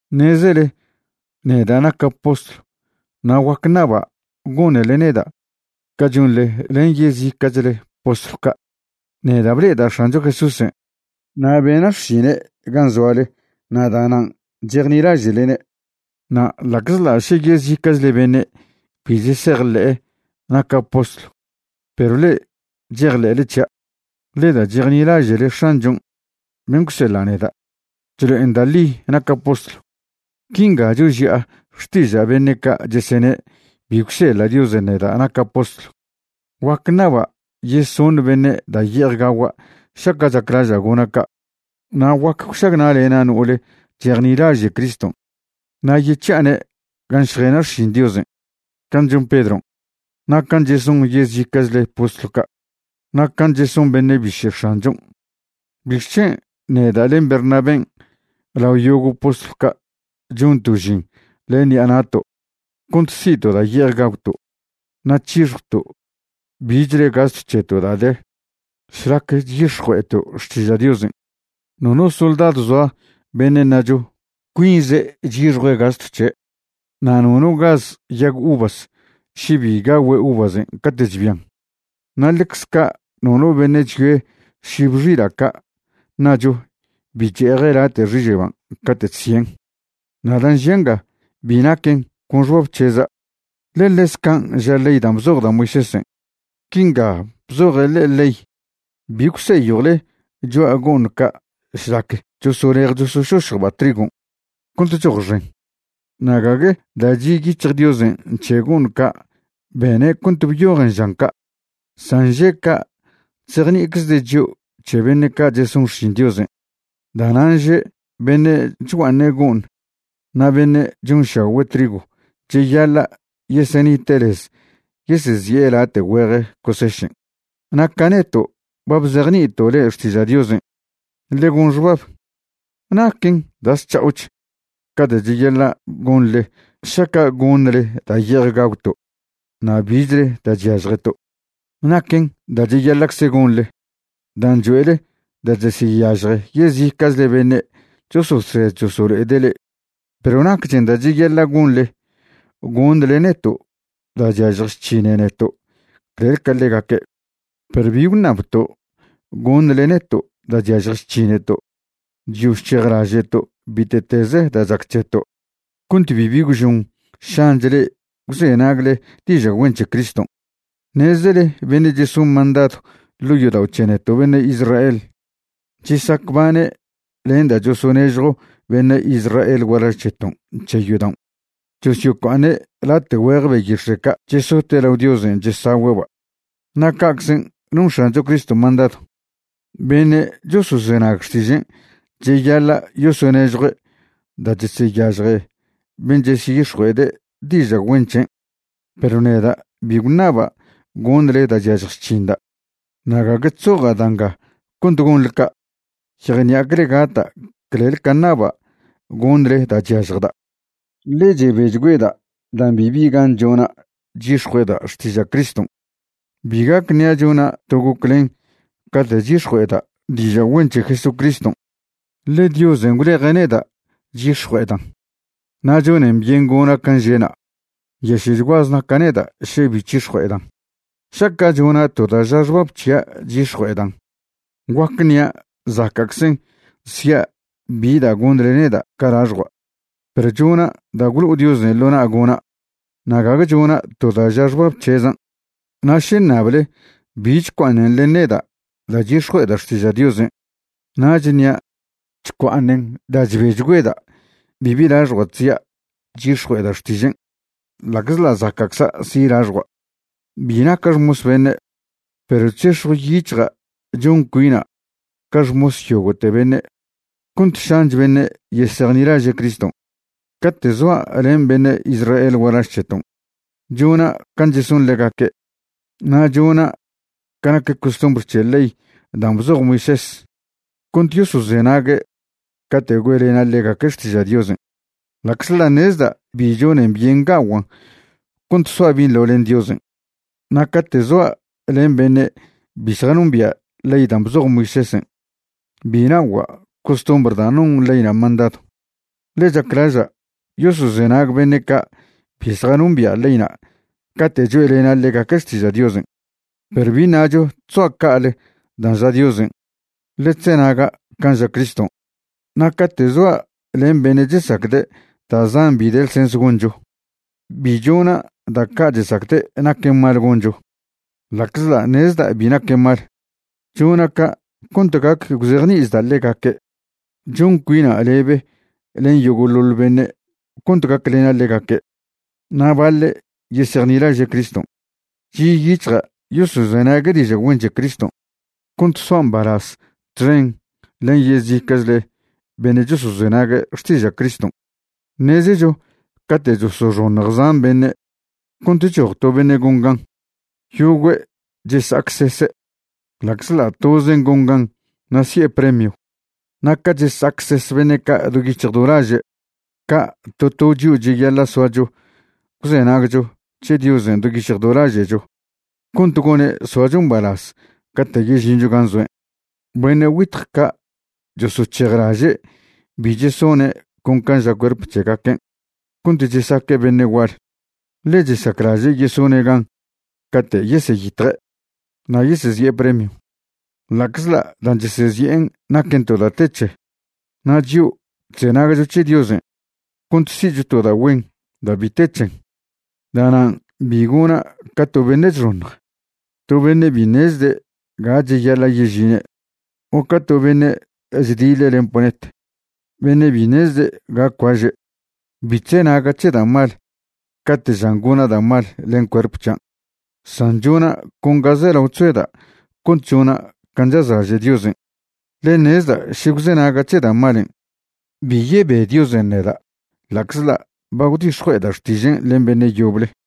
Ṉezele neda' naca' postlw na' guac ṉaba' gonele neda' ca chonḻe len yezica'chle postlw ca'. Neda' ble'eda' X̱ancho Jesúsen' na' bena' xšine' gan' zoale na' da'nan' chejnilaže'lene'. Na' ḻa'czḻa' še yezica'chle beṉe' bi chesejḻe'e naca' postlw, perw le'e chejḻe'le c̱hia', ḻe da' chejnilaže'le X̱anchon' ben' gwseḻa' neda', chlo'en da' ḻi naca' postlw. Quinga choži'a xtiža' beṉe' ca' chesene' bi gwseḻa' Diosen' neda' naca' postlw: Guac ṉaba' yeson beṉe' da' ye'ej gagua' šaca' chaclaža' gona' ca'. Na' guac gwšagna'lena' no'ole chejnilaže' Criston', na' yec̱hi'ane' gan' šjena' xšin Diosen', can' chon Pedron', na' can' cheson yezica'chle postlw ca' na' can' cheson beṉe' biše' X̱anchon'. ¿Bixc̱hen' neda' len Bernaben' lao yogo' postlw ca' chonto' žin len ṉi'a na'to' cont si'to' da' ye'ej gagwto' na' c̱hixjwto' bichle gastw c̱heto' da' de šlac chyix̱jue'eto' xtiža' Diosen'? Nono soldadw zoa beṉe' ṉacho cuinze' chyixjue' gastw c̱he'. Na' nono gaz yag uvas še bi gagüe' uvasen' cate' chbian. Na' ḻecze ca' nono beṉe' chyoe šib xila' ca' ṉacho bi che'eje' late' xiže'ba' cate' chsien'. Na' dan' žia' nga bi naquen con xbab c̱heza', ḻe ḻez can' ža ley dan' bzoj da' Moisésen'. Quinga bzoje' ḻe'e ley: “Bi gwseyjwle cho'a go'ṉ ca' šlac chosolej chosošošjba' trigon' cont choj xen.” Na' gague da' chi' yic̱hj Diosen' c̱he go'ṉ ca' bene' cont byojen žan ca'. San že' ca' chzejni'iczde' chio' c̱he beṉe' ca' cheson xšin Diosen'. Da'nan' že' beṉe' chgua'aṉe' go'ṉ na' beṉe' chonšagüe' trigw cheyaḻa' yesenite' lez yesezi'e late' güeje cosešen'. Na' ca neto' ba bzejni'ito' le'e xtiža' Diosen', ḻe gon xbab ¿naquen da' zc̱ha'och ca da' cheyaḻa' gonḻe šaca' goṉle da' ye'ej gagwto' na' bichle da' chyažjeto'? Naquen da' cheyaḻa'cze gonḻe dan' choe'le da' cheseyažje yezica'chle beṉe' chososed chosolo'ede' le'e, perw nacchen da' cheyaḻa' gonḻe goṉle neto' da' chyažj chc̱hine neto' clel ca ḻegaque'. Perw bi gwṉabto' goṉle neto' da' chyažj chc̱hineto'. Chyo chc̱hejlaže'to' bite'teze da' chac c̱heto' cont bibi gwžon šanch le'e gwzenagle diža' güen c̱he Criston'. Ṉezele beṉe' cheson mandadw ḻo' yodao' c̱he neto' beṉe' Israel chesacbane' len da' chosonežjw beṉe' Israel gualaž c̱heton' c̱he yodaon', chosyocua'aṉe' late' güeje beyix̱e' ca' chesote' lao Diosen' chesagüe'ba'. Na' ca'czen' non X̱ancho Criston' mandadw, beṉe' chosozenag xtižen' cheyaḻa' yosonežjue' da' cheseyažje ben' cheseyix̱jue'ede' diža' güen c̱hen'. Perw neda' bi gwṉaba' goṉle da' chyažj chc̱hinda', na' gague chzoja' da' nga cont gonḻe ca'. Yejṉi'acle gata' clel ca ṉaba' goṉle da' chyažjda', ḻe chebechgüeda' dan' bibi gan chona' chyix̱jue'eda' xtiža' Criston'. Bi gac ṉia' chona' to goclen cate' chyix̱jue'eda' diža' güen c̱he Jesucriston', ḻe Diosen' gwleje' neda' chyix̱jue'edan' na' chonen byen gona' can' že'na'. Nyaše'chguaze naca' neda' še bi c̱hix̱jue'edan'. Šaca' chona' to da' ža xbab c̱hia' chyix̱jue'edan', guac ṉia' zaca'czen sia' bi da' goṉle neda' ca laxjua'. Perw chona' da' gwlo'o Diosen' ḻo na' gona', na' gague chona' to da' ža xbab c̱hezan'. Na' še ṉable bi chcua'aṉen len neda' da' chyix̱jue'eda' xtiža' Diosen', nach ṉia' chcua'aṉen da' chbechgüeda' bibi laxjua' chzia' chyix̱jue'eda' xtižen', ḻa'czḻa' zaca'cza' si' laxjua'. Bi naca' xmos beṉe', perw chzex̱jw yic̱hja' chon cuina' ca xmos yogo'te beṉe' cont šanch beṉe' yesejnilaže' Criston'. Cate' zoa' len beṉe' Israel gualaž c̱heton', chona' can' cheson ḻegaque' na' chona' ca nac costumbr c̱he ley dan' bzoj Moisés cont yosozenague' cate' güe'lena' ḻegaque' xtiža' Diosen', ḻa'czḻa' ṉezda' bi chonen byen ga'oguan' cont soa' binḻo len Diosen'. Na' cate' zoa' len beṉe' bi zjanombia' ley dan' bzoj Moisésen', bi na'ogua' costumbr da' non leyna' mandadw, ḻe chaclaža' yosozenag beṉe' ca' bi zjanombia' leyna' cate' choe'lena' ḻegaque' xtiža' Diosen'. Perw bi ṉacho chzoa' ca'ale dan' ža Diosen', ḻe chzenaga' can' ža Criston'. Na' cate' zoa' len beṉe' chesacde' da' zan bi de lsens goncho, bi chona' da' ca' chesacde' naquen mal goncho, ḻa'czḻa' ṉezda' bi naquen mal. Chona' ca' cont gac gwzejni'ichda' ḻegaque'. Chon cuina' lebe len yogo'ḻoḻ beṉe' cont gaclena' ḻegaque' na' baḻe' yesejnilaže' Criston'. Chi' yic̱hja' yosozenague' diža' güen c̱he Criston' cont soa' mbalaz txen len yezica'chle beṉe' chosozenague' xtiža' Criston'. Ṉezecho cate' chosoxoṉj zan beṉe' cont choj to beṉe gon gan, yogüe' chesa'acsese', ḻa'czḻa' tozen' gon gan na' si'e premio. Na' ca chesa'acses beṉe' ca' do yic̱hj do laže', ca' to to chio' cheyaḻa' soacho gwzenagcho c̱he Diosen' do yic̱hj do laže'cho cont gone' soacho mbalaz cate' yežincho gan' zoen'. Beṉe' güitj ca' chosoc̱hejlaže' bi chesone' con can' ža cuerp c̱hegaquen' cont chesaque' beṉe' gual, ḻe chesaclaže' yesone' gan cate' yeseyitje' na' yesezi'e premio, ḻa'czḻa' dan' chesezi'en naquen to da' te c̱he. Na' chio', chzenagcho c̱he Diosen' cont si'cho to da' güen da' bi te c̱hen. Da'nan' bi gona' ca to beṉe' chxoṉj, to beṉe' bi ṉezde' ga cheyaḻa' yežine', o ca to beṉe' chdiḻe' len ponet, beṉe' bi ṉezde' ga cuaže'. Bi chzenaga' c̱he da' mal cate' žan gona' da' mal len cuerp c̱hian', san chona' con ga zelao chzoeda' cont chona' can' chazlaže' Diosen'. Ḻe ṉezda' še gwzenaga' c̱he da' malen', bi yebe Diosen' neda' ḻa'czḻa' ba gwdix̱jue'eda' xtižen' len beṉe' yoble.